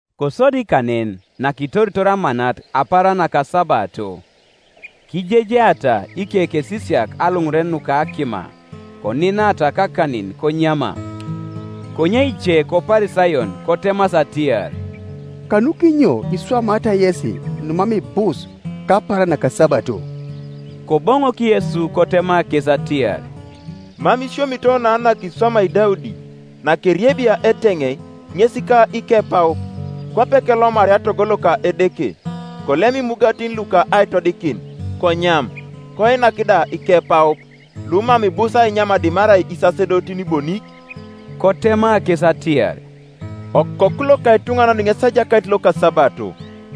Kosodi kanen nakitoritor amanat apaaran nakasabato, kijejeata ikekesisiak aluŋuren nuka akima, koninata kakanin konyama. Konye ice koParisayon kotemasi atiar, “Kanukinyo iswamaata yesi numam ibus kapaaran nakasabato?” Koboŋok Yesu kotema kes atiar, “Mam isiomito na nakiswamai Daudi, nakeriebia eteŋei, ŋes ka ikepaup; kwape kelomaria togo loka Edeke, kolem imugatin luka aitodikin, konyam, koinak da ikepaup; lumam ibus ainyam dimarai isasedotin bonik?” Kotema kes atiar, “Okoku loka etuŋanan ŋes ejakait loka asabato.”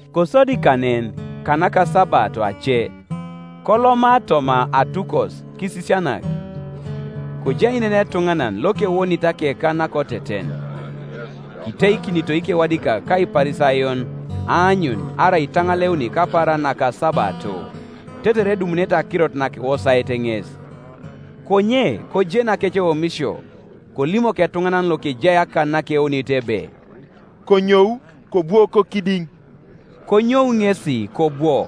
Kosodi kanen, kanakasabato ace, koloma toma atukos kisisianak: kojai nen etuŋanan, lokewonit akekan nakoteten. Kiteikinito ikewadikak ka Iparisayon, aanyun arai itaŋaleuni kapaaran nakasabato; tetere edumunete akirot nakiwosaet ŋes. Konye kojeni akeceomisio; kolimok etuŋanan lokejai akan nakewonit ebe, “Konyou, kobwo kokidiŋ.” Konyou ŋesi kobwo.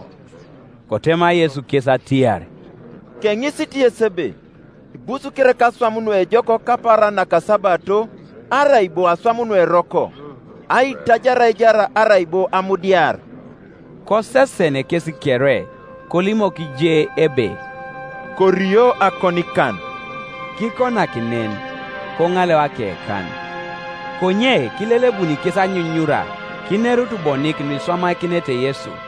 Kotema Yesu kes atiar, “Keŋisit yes ebe, Ibus kereka aswam nuejok kapaaran nakasabato, arai bo aswam nueroko, aitajar aijar arai bo amudiar?” Kosesen kes kere, kolimok je ebe, “Korio akonikan.” Kikonak nen: koŋaleu akekan, Konye kilelebun kes anyunyura, kinerut bonik nuiswamakinete Yesu.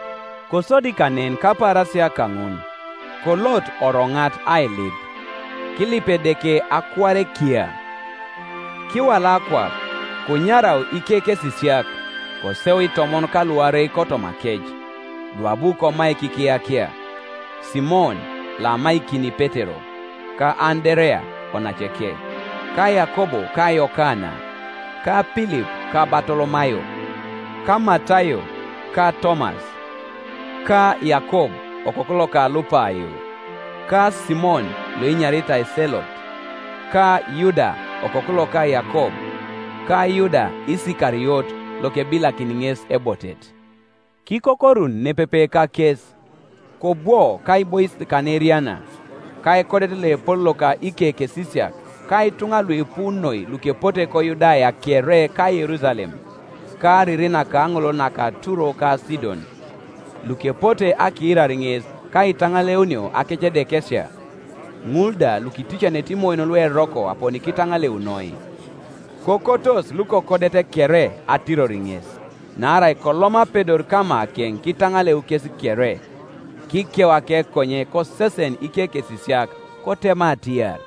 Kosodi kanen kapaarasia kaŋun, kolot oroŋat ailip; kilip Edeke akuare kiya. Kiwala akwap, konyarau ikekesisiak; koseu itomon ka luarei kotomakec, luabu komaik ikiyakia; Simon, loamaikini Petero, ka Anderea onaceke, ka Yakob ka Yokana, ka Pilip ka Batolomayo, ka Matayo ka Tomas, ka Yakob okoku loka Alupayo, ka Simon loenyaritai Selot, ka Yuda okoku loka Yakob, ka Yuda Isikariot, lokebilakini ŋes ebotet. Kikokorun nepepe kakes, kobwo kaibois kanaeriana, ka ekodet loepol loka ikekesisiak, ka ituŋa luipu noi lukepote koYudaya kere ka Yerusalem, ka ariri nakaŋolol nako Turo ka Sidon, lukepote akiirar ŋes, ka aitaŋaleunio akecedekesia: ŋul da lukiticanete imoyon lueroko aponi kitaŋaleunoi. Kokotos lukokodet kere atiror ŋes; naarai kolom apedor kamakeŋ kitaŋaleu kes kere. Kikeu akekonye kosesen ikekesisiak, kotema atiar,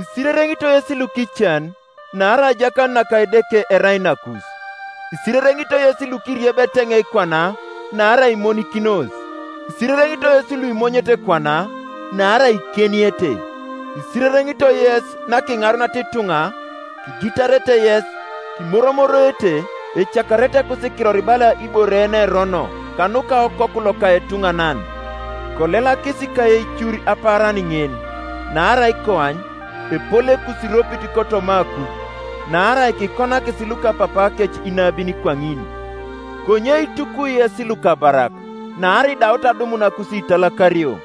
“Isirereŋitoi yes lukican; naarai ajakanut naka Edeke erai nakus. “Isirereŋitoi yes lukiriebi eteŋei kwana; naarai imonikinos. “Isirereŋitoi yes luimonyete kwana: naarai ikieniete. “Isirereŋitoi yes, nakiŋaruniata ituŋa, kigitarete yes, kimoromoroete, ecakarete ekusikiror bala ibore yenerono, kanuka Okoku loka etuŋanan. Kolelakis ka eicur apaaran ŋin: naarai koany, epol ekusiropit kotoma akui: naarai kikonakis, lukapapaakec inabin kwaŋin. “Konye itukwi yes lukabarak! Naarai idaut adumun akusiitaakario.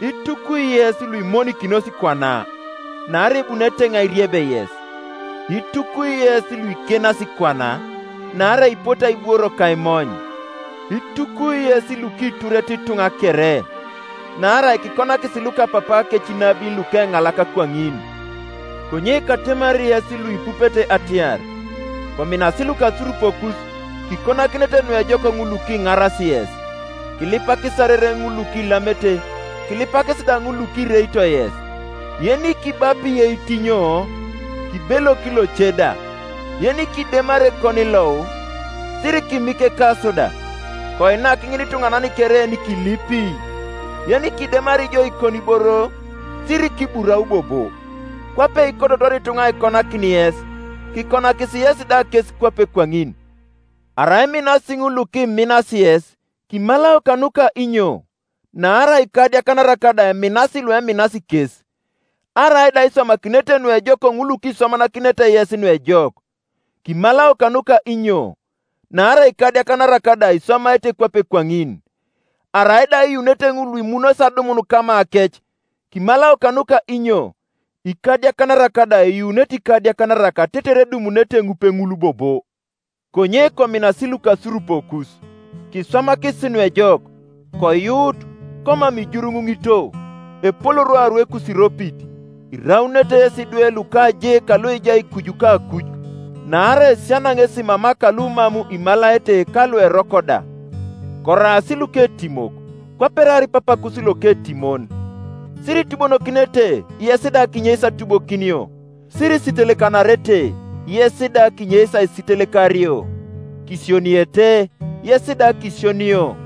“Itukwi yes, luimonikinos kwana! Naarai ebuni eteŋei airieb yes. “Itukwi yes, luikienasi kwana! Naarai ipote aibworo ka aimony. “Itukwi yes, lukiturete kwana kere! Naarai kikonakis lukapapaakec inabin lukeŋalak kwaŋin. “Konye katemari yes luipupete atiar, Kominasi lukasurupokus, kikonakinete nuejok ŋul lukinaras yes, kilipakis arereŋ ŋul lukilamete, kilipakis da ŋul lukireito yes. Yenikibapi eitinyo, kibelok loce da; yenikidemari ekonilou, sirikimik ekaso da. Koinak ŋinituŋanan kere yenikilipi; yenikidemari jo ikoniboro sirikiburau bobo. Kwape ikototor ituŋa aikonakin yes, kikonakis yesi da kes kwape kwaŋin. “Arai iminasi ŋul lukiminasi yes, kimalao kanuka inyo? Naarai ikadiakanarak da eminasi lueminasi kes. Arai da iswamakinete nuejok ŋul lukiswamakinete yes nuejok, kimalao kanuka inyo? Naarai ikadiakanarak da iswamaete kwape kwaŋin. Arai da iyuunete ŋul luimunos adumun kamakec, kimalao kanuka inyo? Ikadiakanarak da eyuunete ikadiakanarak tetere edumunete ŋupeŋul bobo. Konye kominasi lukasurupokus, kiswamakisi nuejok, koyuut, komam ijuruŋuŋito; epol rwaru ekusiropit, iraunete yesi idwe luka Je kaloejai kuju kakuj: naarai esiana ŋesi mama kalumam imalaete ka lueroko da. Koraas luketimok, kwape eraar Papakus loketimon. “Siritubonokinete, yes da kinyeis atubokinio: sirisitelekanarete, yes da kinyeis aisitelekario; kisioniete, yes da kisionio;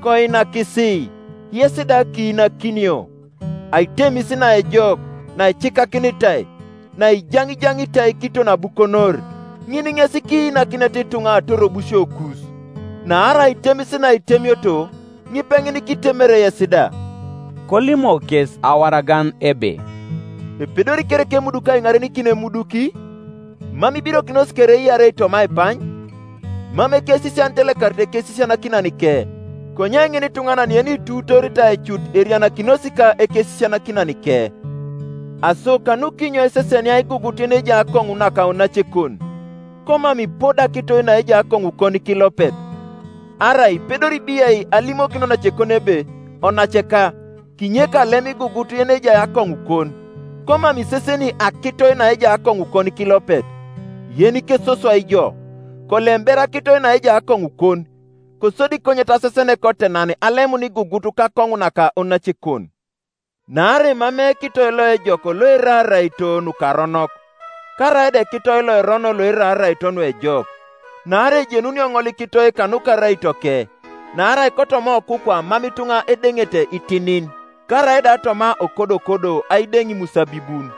koinakisi, yes da kiinakinio; aitemis naejok, naicikakinitai, naijaŋijaŋitai, kiton abukonor, ŋin ŋes kiinakinete ituŋa atorobusiokus. Naarai aitemis naitemioto, ŋipeŋin kitemere yes da.” Kolimok kes awaragan ebe, “Epedori kereka emuduki aiŋarenikin emuduki? Mam ibirokinos kere iarei toma aipany? Mam ekesisian itelekari ekesisianakinanike, konye ŋinituŋanan yenituutooritai cut erianakinos ka ekesisianakinanike. Aso kanukinyo isesenia igugut yenejai akoŋu naka onacekon, komam ipodo akitoi naejai akoŋukon kilopet? Arai ipedori biai alimokin onacekon ebe, ‘Onaceka, kinyek kalem igugut yenejai akoŋukon’, komam iseseni akitoi naejai akoŋukon kilopet? Yenikesoswai ijo, kolem ber akitoi naejai akoŋukon, kosodi konyet asesen kotenan alemun igugut kakoŋu naka onacekon. “Naarai emamei ekitoi loejok loerai araito nukaronok; karaida ekitoi loerono loerai araito nuejok. Naarai ejenunio ŋolikitoi kanuka araitoke. Naarai kotoma okukwa mam ituŋa edeŋete itinin, karaida toma okodokodo aideŋ imusabibun.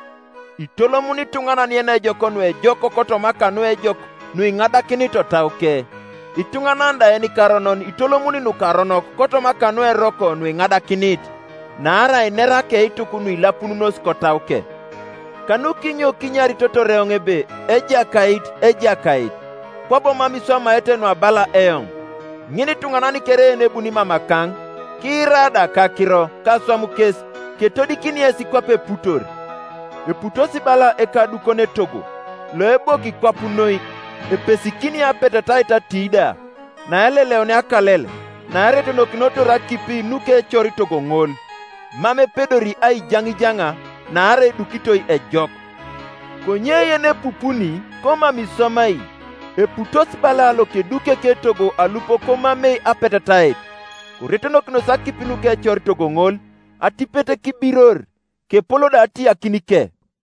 Itolomuni ituŋanan yenejok nuejok kotoma kanuejok nuiŋadakinit otauke; ituŋanan da yenikaronon itolomuni nukaronok kotoma kanueroko nuiŋadakinit: naarai inera akeituk nuilapununos kotauke. Kanukinyo kinyaritotor eoŋ ebe, ‘Ejakait, Ejakait,’ kwabo mam iswamaete nuabala eoŋ? Ŋinituŋanan kere yenebuni mamakaŋ, kiira da akakiro ka aswam kes, ketodikini yes kwape eputor: Eputos bala ekadukon etogo, loeboki kwap noi, epesikini apetetait atiida; naeleleunia akalel, naeretonokinotor akip nukecor togo ŋol, mam epedori aijaŋijaŋa: naarai edukitoi ejok. Konye yenepupuni, komam iswamai, eputos bala lokeduki eketogo alup komamei apetetait; koretonokinos akip nukecor togo ŋol, atipet kibiror; kepol da atiyakinike.”